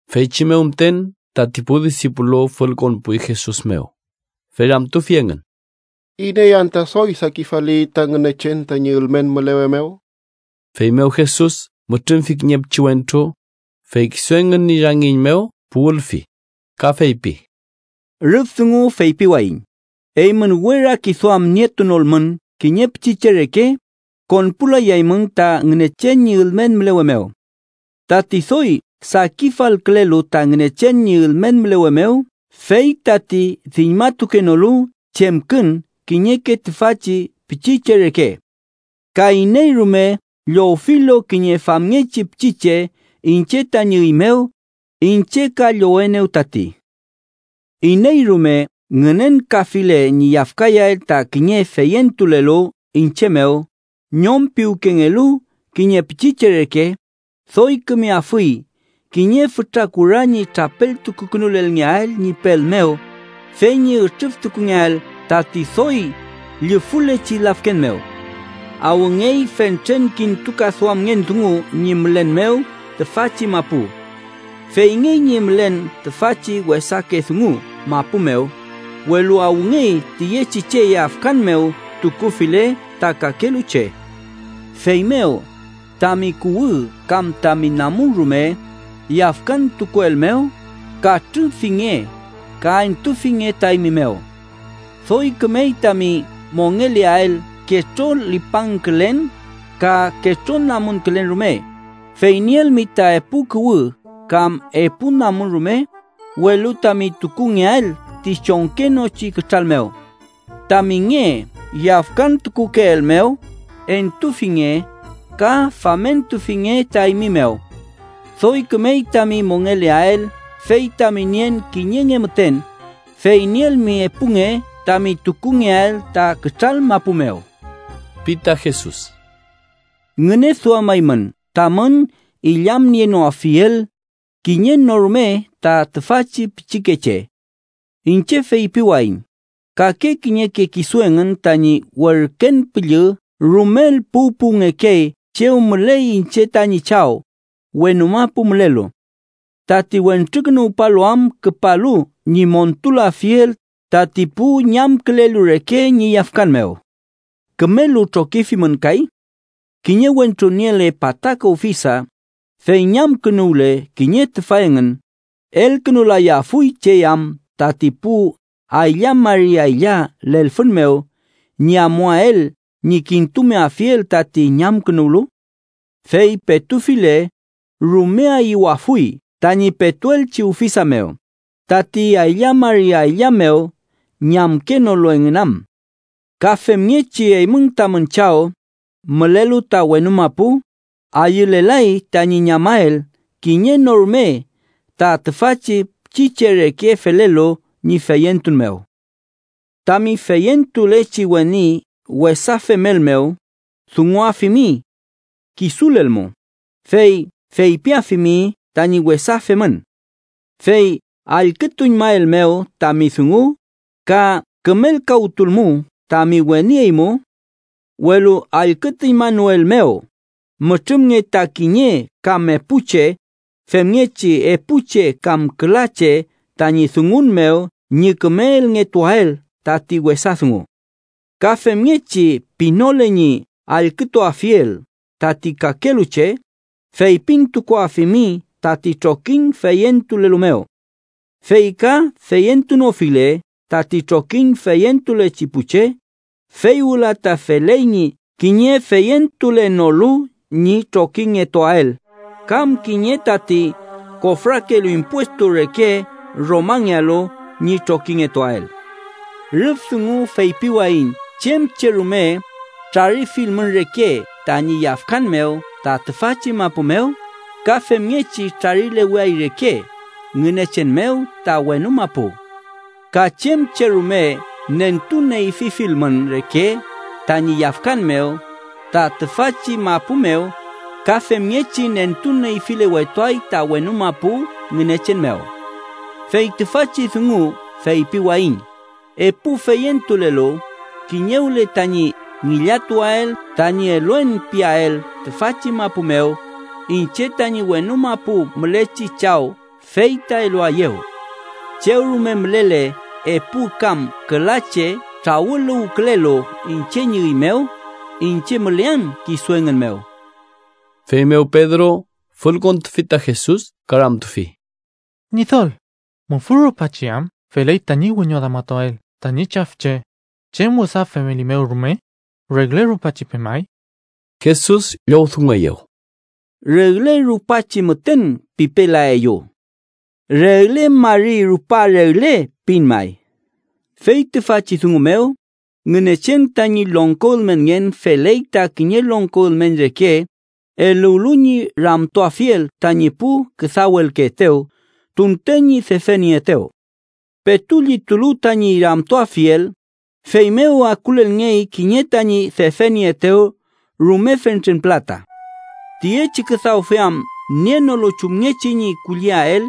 Feychi mew müten tati pu disipulu fülkonpuy Jesus mew, fey ramtufi engün: —¿Iney anta doy sakifali ta Ngünechen tañi ülmen mülewe mew? Feymew Jesus mütrümfi kiñe pichiwentru, fey kisu engün ñi rangiñ mew puwülfi ka feypi: —Rüf dungu feypiwayiñ eymün we rakiduam nietunolmün kiñe pichiche reke, konpulayaymün ta Ngünechen ñi ülmen mülewe mew. Tati doy sakifalkülelu ta Ngünechen ñi ülmen mülewe mew fey tati diñmatukenolu chemkün kiñeke tüfachi pichiche reke. Ka iney rume llowfilu kiñe famngechi pichiche iñche tañi üy mew, iñche ka llowenew tati. “Iney rume ngünenkafile ñi yafkayael ta kiñe feyentulelu iñche mew ñom piwkengelu kiñe pichiche reke, doy kümeafuy kiñe fütra kura ñi trapeltukukünulelngeael ñi pel mew, fey ñi ütrüftukungeael tati doy llufülechi lafken mew. “¡Awngey fentren kintukaduamngen dungu ñi mülen mew tüfachi mapu! Feyngey ñi mülen tüfachi wesake dungu mapu mew, welu ¡awngey tiyechi che yafkan mew tukufile ta kakelu che! Feymew, tami kuwü kam tami namun rume yafkantukuelmew, katrüfinge ka entufinge ta eymi mew. Doy kümey tami mongeleael ketrolipangkülen ka ketronamunkülen rume, fey nielmi ta epu kuwü kam epu namun rume, welu tami tukungeael ti chongkenochi kütral mew. Tami nge yafkantukukeelmew, entufinge ka famentufinge ta eymi mew. Doy kümey tami mongeleael fey tami nien kiñe nge müten, fey nielmi epu nge tami tukungeael ta kütral mapu mew ―pi ta Jesus. “Ngüneduamaymün tamün illamnienoafiel kiñe no rume ta tüfachi pichikeche. Iñche feypiwayiñ kake kiñeke kisu engün tañi werken püllü rumel puwpuwngekey chew müley iñche tañi Chaw, wenu mapu mülelu. Tati Wentrukünuwpalu am küpalu ñi montulafiel tati pu ñamkülelu reke ñi yafkan mew. “¿Kümelu trokifimün kay? Kiñe wentru niele pataka ufisa, fey ñamkünuwle kiñe tüfa engün, ¿elkünulayafuy chey am tati pu aylla mari aylla lelfün mew, ñi amuael ñi kintumeafiel tati ñamkünuwlu? Fey petufile, rume ayüwafuy tañi petuelchi ufisa mew, tati aylla mari aylla mew ñamkenolu engün am. Ka femngechi, eymün tamün Chaw, mülelu ta wenu mapu, ayülelay tañi ñamael kiñe no rume ta tüfachi pichiche reke felelu ñi feyentun mew. “Tami feyentulechi weni wesa femelmew, dunguafimi. Kisulelmu, fey feypiafimi tañi wesa femün. Fey allkütuñmaelmew tami dungu, ka kümelkawtulmu tami weni eymu. Welu allkütuñmanoelmew, mütrümnge ta kiñe kam epu che, femngechi epu che kam küla che tañi dungun mew ñi küme elngetuael tati wesa dungu. Ka femngechi pinole ñi allkütuafiel tati kakelu che, feypintukuafimi tati trokiñ feyentulelu mew. Fey ka feyentunofile tati trokiñ feyentulechi pu che, fey wüla ta feley ñi kiñe feyentulenolu ñi trokingetuael kam kiñe tati kofrakelu impuestu reke Romangealu ñi trokingetuael. “Rüf dungu feypiwayiñ chem che rume trarifilmün reke tañi yafkan mew ta tüfachi mapu mew, ka femngechi trarileweay reke Ngünechen mew ta wenu mapu. Ka chem che rume nentu neyfifilmün reke tañi yafkan mew ta tüfachi mapu mew, ka femngechi nentu neyfilewetuay ta wenu mapu Ngünechen mew. “Fey tüfachi dungu feypiwayiñ: Epu feyentulelu, kiñewle tañi ngillatuael tañi eluen piael tüfachi mapu mew, iñche tañi wenu mapu mülechi Chaw fey ta eluaeyew. Chew rume mülele epu kam küla che trawüluwkülelu iñche ñi üy mew, iñche mülean kisu engün mew.” Feymew Pedro fülkontufi ta Jesus ka ramtufi: —Ñidol, ¿mufü rupachi am feley tañi wiñoduamatuael tañi chafche, chem wesa femelimew rume? ¿Regle rupachi pemay? Jesus llowdungueyew: —Regle rupachi müten pipelaeyu. Regle mari rupa regle pin may. “Fey tüfachi dungu mew, Ngünechen tañi longko ülmenngen feley ta kiñe longko ülmen reke eluwlu ñi ramtuafiel tañi pu küdawelkeetew tunten ñi defenieetew. Petu llitulu tañi ramtuafiel, feymew akulelngey kiñe tañi defenieetew rume fentren pülata. Tiyechi küdawfe am nienolu chumngechi ñi kulliael,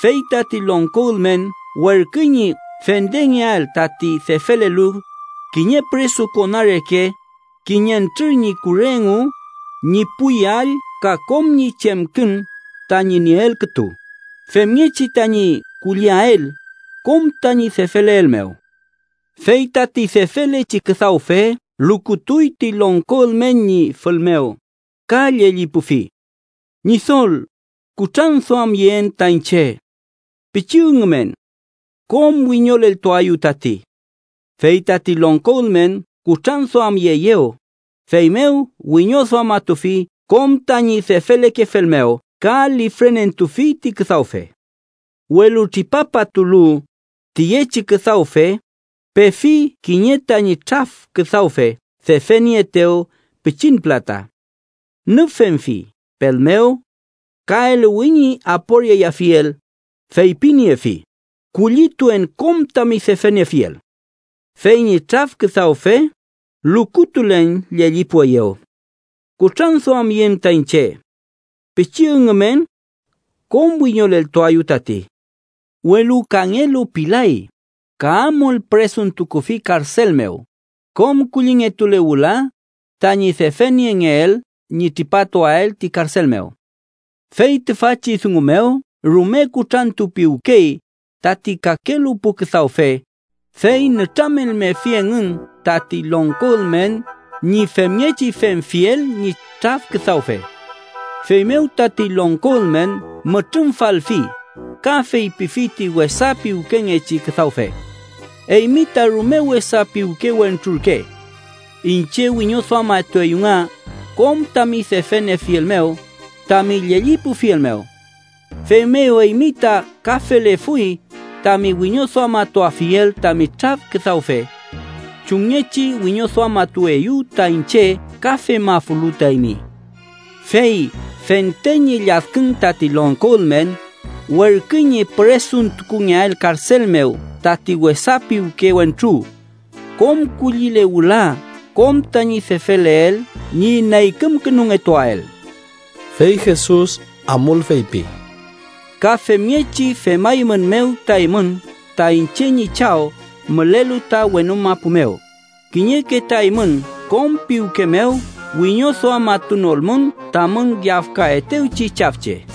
fey tati longko ülmen werküy ñi fendengeael tati defelelu, kiñe püresukona reke, kiñentrür ñi kure engu, ñi pu yall ka kom ñi chemkün tañi nieel kütu, femngechi tañi kulliael kom tañi defeleel mew. “Fey tati defelechi küdawfe lukutuy ti longko ülmen ñi fül mew, ka llellipufi: ‘Ñidol, kutranduamyeen ta iñche. Pichi üngümen. Kom wiñoleltuaeyu tati.’ Fey tati longko ülmen kutranduamyeeyew, feymew wiñoduamatufi kom tañi defelekefel mew ka lifrenentufi ti küdawfe. “Welu tripapatulu, tiyechi küdawfe pefi kiñe tañi traf küdawfe defenieetew pichin pülata. Nüfemfi pel mew ka eluwi ñi aporiayafiel, feypiniefi: ‘¡Kullituen kom tami defeniefiel!’ Fey ñi traf küdawfe lukutulen llellipueyew: ‘Kutranduamyeen ta iñche. Pichi üngümen. Kom wiñoleltuaeyu tati.’ Welu kangelu pilay, ka amul püresuntukufi karsel mew kom kullingetule wüla tañi defeniengeel ñi tripatuael ti karsel mew. “Fey tüfachi dungu mew rume kutrantupiwkey tati kakelu pu küdawfe, fey nütramelmefi engün tati longko ülmen ñi femngechi femfiel ñi traf küdawfe. Feymew tati longko ülmen mütrümfalfi, ka feypifi ti wesa piwkengechi küdawfe: ‘¡Eymi ta rume wesa piwke wentru ürke! Iñche wiñoduamatueyu nga kom tami defeniefiel mew tami llellipufiel mew. Feymew eymi ta ka felefuy tami wiñoduamatuafiel tami traf küdawfe. Chumngechi wiñoduamatueyu ta iñche ka femafulu ta eymi.’ “Fey fente ñi lladkün tati longko ülmen, werküy ñi püresuntukungeael karsel mew tati wesa piwke wentru kom kullile wüla kom tañi defeleel ñi neykümkünungetuael.” Fey Jesus amul feypi: “Ka femngechi femaeymünmew ta eymün ta iñche ñi Chaw mülelu ta wenu mapu mew, kiñeke ta eymün kom piwke mew wiñoduamatunolmün tamün yafkaetewchi chafche.”